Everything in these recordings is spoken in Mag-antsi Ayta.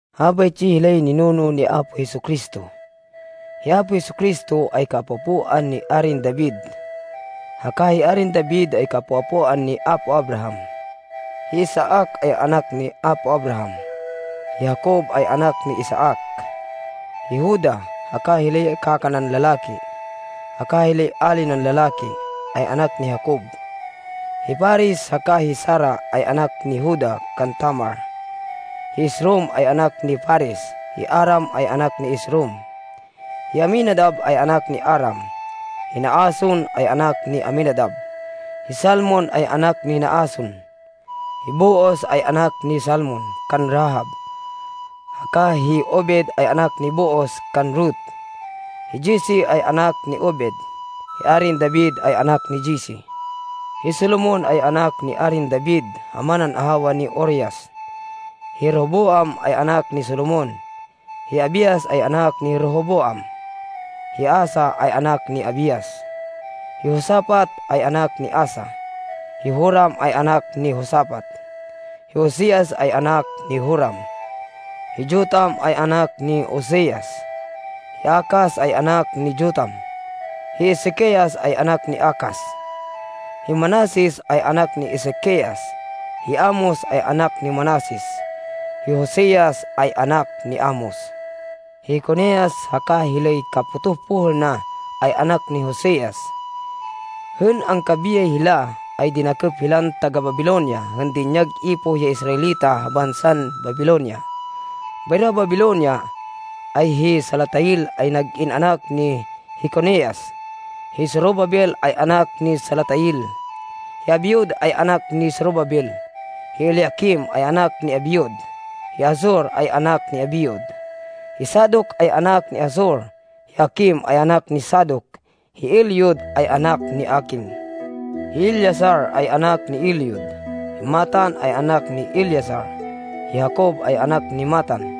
Habaytsi hilay ninuno ni Apo Jesu-Cristo. Hi Apo Jesu-Cristo ay kaapo-apoan ni Arin David haka hi Arin David ay kaapo-apoan ni apo Abraham. Hi Isaac ay anak ni apo Abraham, hi Jacob ay anak ni Isaac, hi Juda, haka hilay kaka nan lalaki, haka hilay ali nan lalaki, ay anak ni Jacob. Hi Fares haka hi Zara ay anak ni Juda kan Tamar. Hi Esrom ay anak ni Fares, hi Aram ay anak ni Esrom. Hi Aminadab ay anak ni Aram, hi Naason ay anak ni Aminadab, hi Salmon ay anak ni Naason. Hi Booz ay anak ni Salmon kan Rahab, haka hi Obed ay anak ni Booz kan Ruth, hi Jesse ay anak ni Obed. Hi Arin David ay anak ni Jesse, hi Solomon ay anak ni Arin David ha manan ahawa ni Urias. Hi Rehoboam ay anak ni Solomon, hi Abias ay anak ni Rehoboam, hi Asa ay anak ni Abias. Hi Josafat ay anak ni Asa, hi Joram ay anak ni Josafat, hi Ozias ay anak ni Joram. Hi Jotam ay anak ni Ozias, hi Acaz ay anak ni Jotam, hi Ezequias ay anak ni Acaz. Hi Manases ay anak ni Ezequias, hi Amos ay anak ni Manases, hi Josias ay anak ni Amos. Hi Jeconias haka hilay kapotoh pohêl na, ay anak ni Josias. Hên angkabiyay hila, ay dinakêp hilan taga-Babilonia hên dinyag ipoh ya Israelita ha bansan Babilonia. Bayro ha Babilonia, ay hi Salatiel ay nag-in anak ni Jeconias, hi Zorobabel ay anak ni Salatiel. Hi Abiud ay anak ni Zorobabel, hi Eliaquim ay anak ni Abiud, hi Azor ay anak ni Abiud. Hi Sadoc ay anak ni Azor, hi Aquim ay anak ni Sadoc, hi Eliud ay anak ni Aquim. Hi Eleazar ay anak ni Eliud, hi Matan ay anak ni Eleazar, hi Jacob ay anak ni Matan.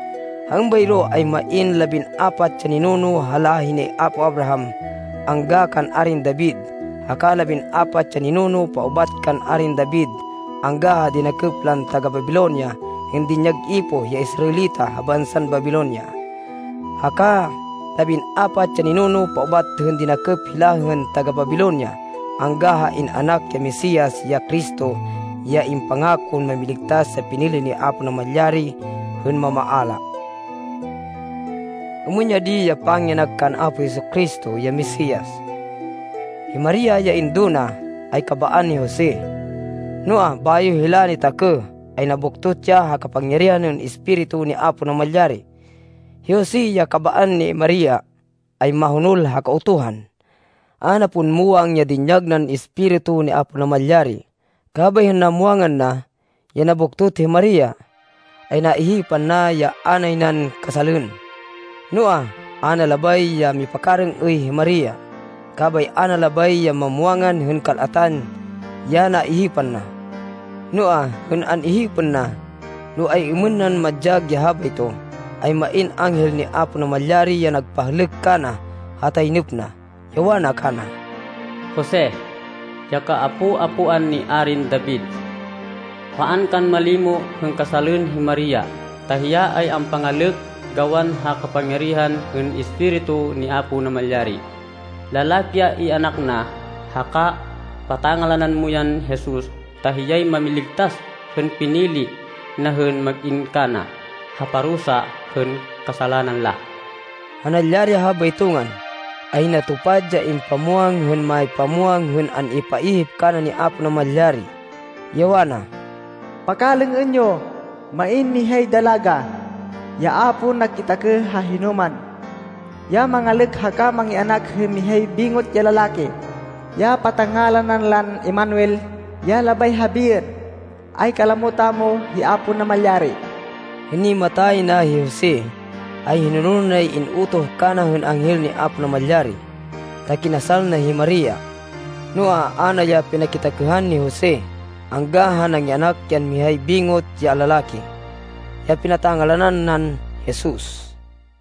Ha êmbayro, ay main labin-apat ya ninuno ha láhi ni apo Abraham angga kan Arin David, haka labin-apat ya ninuno paubat kan Arin David angga ha dinakêp lan taga-Babilonia hên dinyag ipoh ya Israelita ha bansan Babilonia, haka labin-apat ya ninuno paubat hên dinakêp hila hên taga-Babilonia angga ha in-anak ya Mesias, ya Cristo, ya impangakon Mámiligtas ya pinili ni Apo Namalyari hên mamaala. Êmên ya di ya pangianak kan Apo Jesu-Cristo, ya Mesias. Hi Maria ya indo na, ay kabaan ni Jose, noa, bayo hila nitakêh, ay nabuktot ya ha kapangyarihan hên Espiritu ni Apo Namalyari. Hi Jose, ya kabaan ni Maria, ay mahonol ha Kautuhan. A na pon muwang ya dinyag nan Espiritu ni Apo Namalyari, kabay hên namwangan na, ya nabuktot hi Maria, ay naihipan na ya a nay nan kasalên. Noa, a na labay ya mipakarêng-êy hi Maria, kabay a na labay ya mamwangan hên kal-atan ya naihipan na. Noa, hên an-ihipên na, no ay-êmên na madyag ya habayto, ay main anghel ni Apo Namalyari ya nagpahlêk kana ha taynêp na, ya wana kana, “Jose, ya kaapo-apoan ni Arin David, paan kan malimo hên kasalên hi Maria, ta hiya ay ampangalêk gawan ha kapangyarihan hên Espiritu ni Apo Namalyari. Lalaki ya ianak na, haka patangalanan mo yan Jesus, ta hiyay mamiligtas hên pinili na hên mag-in kana, ha parusa hên kasalanan la.” Ha nalyari ya habayto ngan, ay natupad ya impamwang hên mámipamwang hên an-ipaihip kana ni Apo Namalyari, ya wana, “Pakalêng-ên yo, main mihay dalaga, ya a pon nakitakêh ha hinoman, ya mangalêk haka mangianak hên mihay bingot ya lalaki, ya patangalanan lan ‘Emmanuel’ ya labay habiên, ay ‘kalamo tamo hi Apo Namalyari.’” Hên nimata yay na hi Jose, ay hinonol nay in-utoh kana hên anghel ni Apo Namalyari, ta kinasal na hi Maria. Noa, a na ya pinakitakêhan ni Jose, angga ha nangianak yan mihay bingot ya lalaki. Ya pinata-ngalanan nan Jesus.